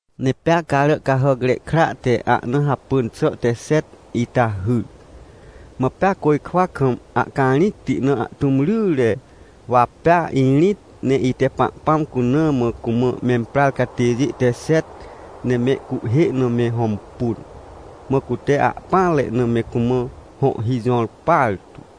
Ne pea Caràcahàcre Kra te ahna hapỳn xà te xet ita hyr, mã pea côjkwa kam ahcarĩcti na ahtũm ryre. Wa pea irĩt, ne ite Pahpãm cuna mã cumã memprar catêjê te xet ne mehcuhhê na me hõmpun. Mã cute ahpỹanre na me cumã hõhhi jõr partu.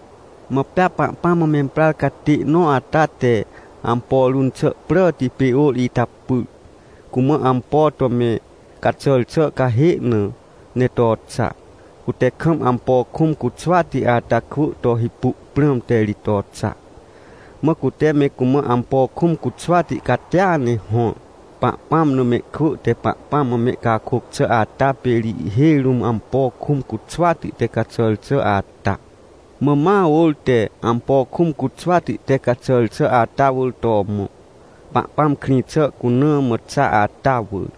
Mã pea Pahpãm mã memprar catê nõ ata te ampo run xà pràti pê ôr ita pyr, cumã ampo to me caxàr xà cahê na ne to xa. Cute kam ampo kũm cuxwati ata kwỳ to hipu prãmte ri to xa. Mã cute me cumã ampo kũm cuxwati catia ne hõr. Pahpãm na mehkwỳ te Pahpãm mã mehcakôc xà ata pê ri ihhêj rũm ampo kũm cuxwati te caxàr xà ata. Mã ma ôr te ampo kũm cuxwati te caxàr xà ata wỳr to mõ, Pahpãm krĩ xà cuna mã xa ata wỳr.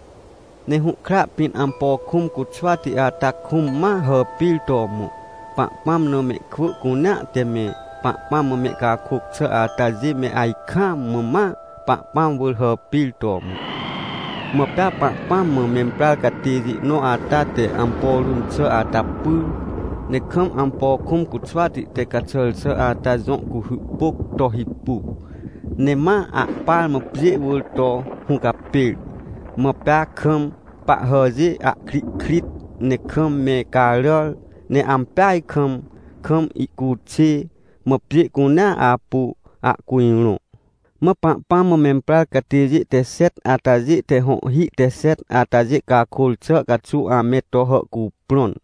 Ne hũhkra pĩn ampo kũm cuxwati ata kũm ma hàpir to mõ, Pahpãm na mehkwỳ cunea te me Pahpãm mã mehcakôc xà atajê me ajkaam mã ma Pahpãm wỳr hàpir to mõ. Mã pea Pahpãm mã memprar catêjê nõ ata te ampo run xà ata pyr, ne kam ampo kũm cuxwati te caxàr xà ata jõ cuhy pôc to hipu, ne ma ahpar mã pjê wỳr to hũcapêr. Mã pea kam pahhàjê ahkrihkrit, ne kam me caràr, ne ampeaj kam, kam ihcuxê, mã pjê cunea apu ahcujrõ. Mã Pahpãm mã memprar catêjê te xet atajê te hõhhi te xet atajê cakôr xà caxuw ame to hàhcuprõn.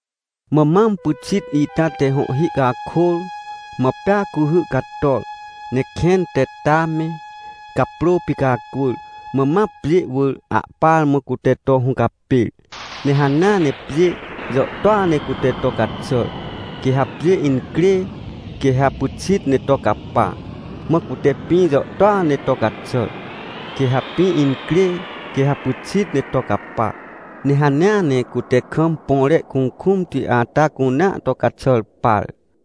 Mã mam pyxit ita te hõhhi cakôr. Mã pea cuhy cator, ne kẽn te ta me, caprô picacwỳr, mã ma pjê wỳr ahpar mã cute to hũcapêr. Ne hanea ne pjê jàhtôa ne cute to caxàr. Quê ha pjê incrê, quê ha pyxit ne to capa. Mã cute pĩ jàhtôa ne to caxàr. Quê ha pĩ incrê, quê ha pyxit ne to capa. Ne hanea ne cute kam põre kukũmti ata cunea to caxàr par.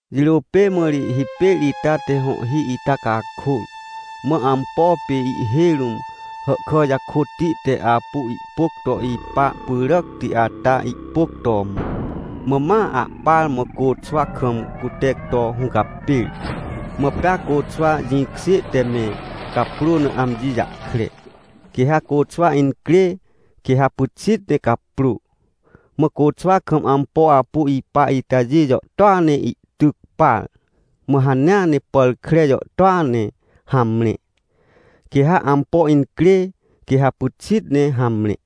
Jirô pê mã ri hipêr ita te hõhhi ita cakôr. Mã ampo pê ihhêj rũm hàhkà jakôtti te apu ihpôc to ipa pyràcti ata ihpôc to mõ, mã ma ahpar mã côxwa kam cute to hũcapêr. Mã pea côxwa jĩkjê te me caprô na amji jahkre. Quê ha côxwa incrê, quê ha pyxit ne caprô. Mã côxwa kam ampo apu ipa itajê jàhtôa ne ihtyc par, mã hanea ne pàr kre jàhtôa ne hamre. Quê ha ampo incrê, quê ha pyxit ne hamre.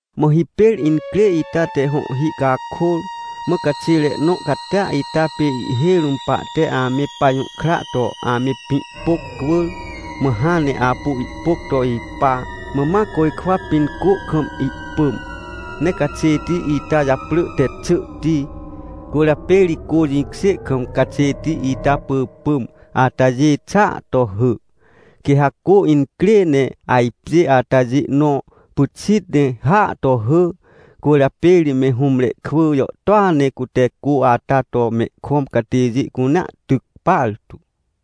Mã hipêr incrê ita te hõhhi cakôr. Mã caxêre nõ catia ita pê ihhêj rũm pahte ame pajũhkra to ame pĩ pôc cwỳr, mã hãn ne apu ihpôc to ipa, mã ma côjkwa pĩn cô kam ihpỳm. Ne caxêti ita japrỳ te Xỳhti. Cwỳrjapê ri cô jĩkjê kam caxêti ita pỳpỳm atajê xỳa to hỳ. Quê ha cô incrê ne ajpjê atajê nõ pyxit ne hỳa to hỳ. Cwỳrjapê ri me hũmre kwỳ jàhtôa ne cute cô ata to mehkõm catêjê cunea tyc partu.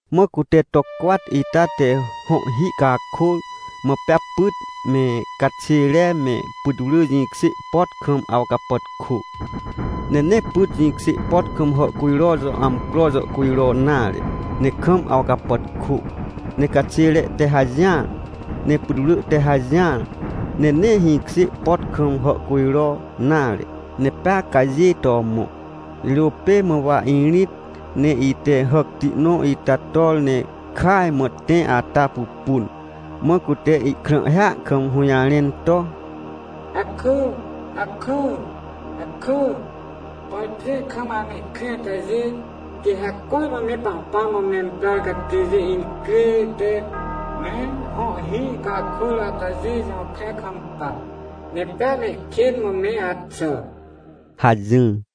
Mã cute to cwat ita te hõhhi cakôr. Mã pea pyt me, caxêre me putwrỳ jĩkjê pot kam awcapàtkô. Ne nee pyt jĩkjê pot kam hàhcujro jõ amcro jàhcujro nare, ne kam awcapàtkô. Ne caxêre te hajỹar, ne putwrỳ te hajỹar, ne nee hĩkjê pot kam hàhcujro nare, ne pea cajê to mõ. Jirô pê mã wa irĩt, ne ite hàcti nõ ita tor ne kàaj mã tẽ ata pupun. Mã cute ihkrãhhia kam hũjarẽn to: — Akỳ, akỳ, akỳ, por pjê kam amehkrĩ atajê, quê ha cormã me Pahpãm mã memprar catêjê incrê te me hõhhi cakôr atajê jõkre kampa, ne pea mehkên mã me axà! — hajỹr.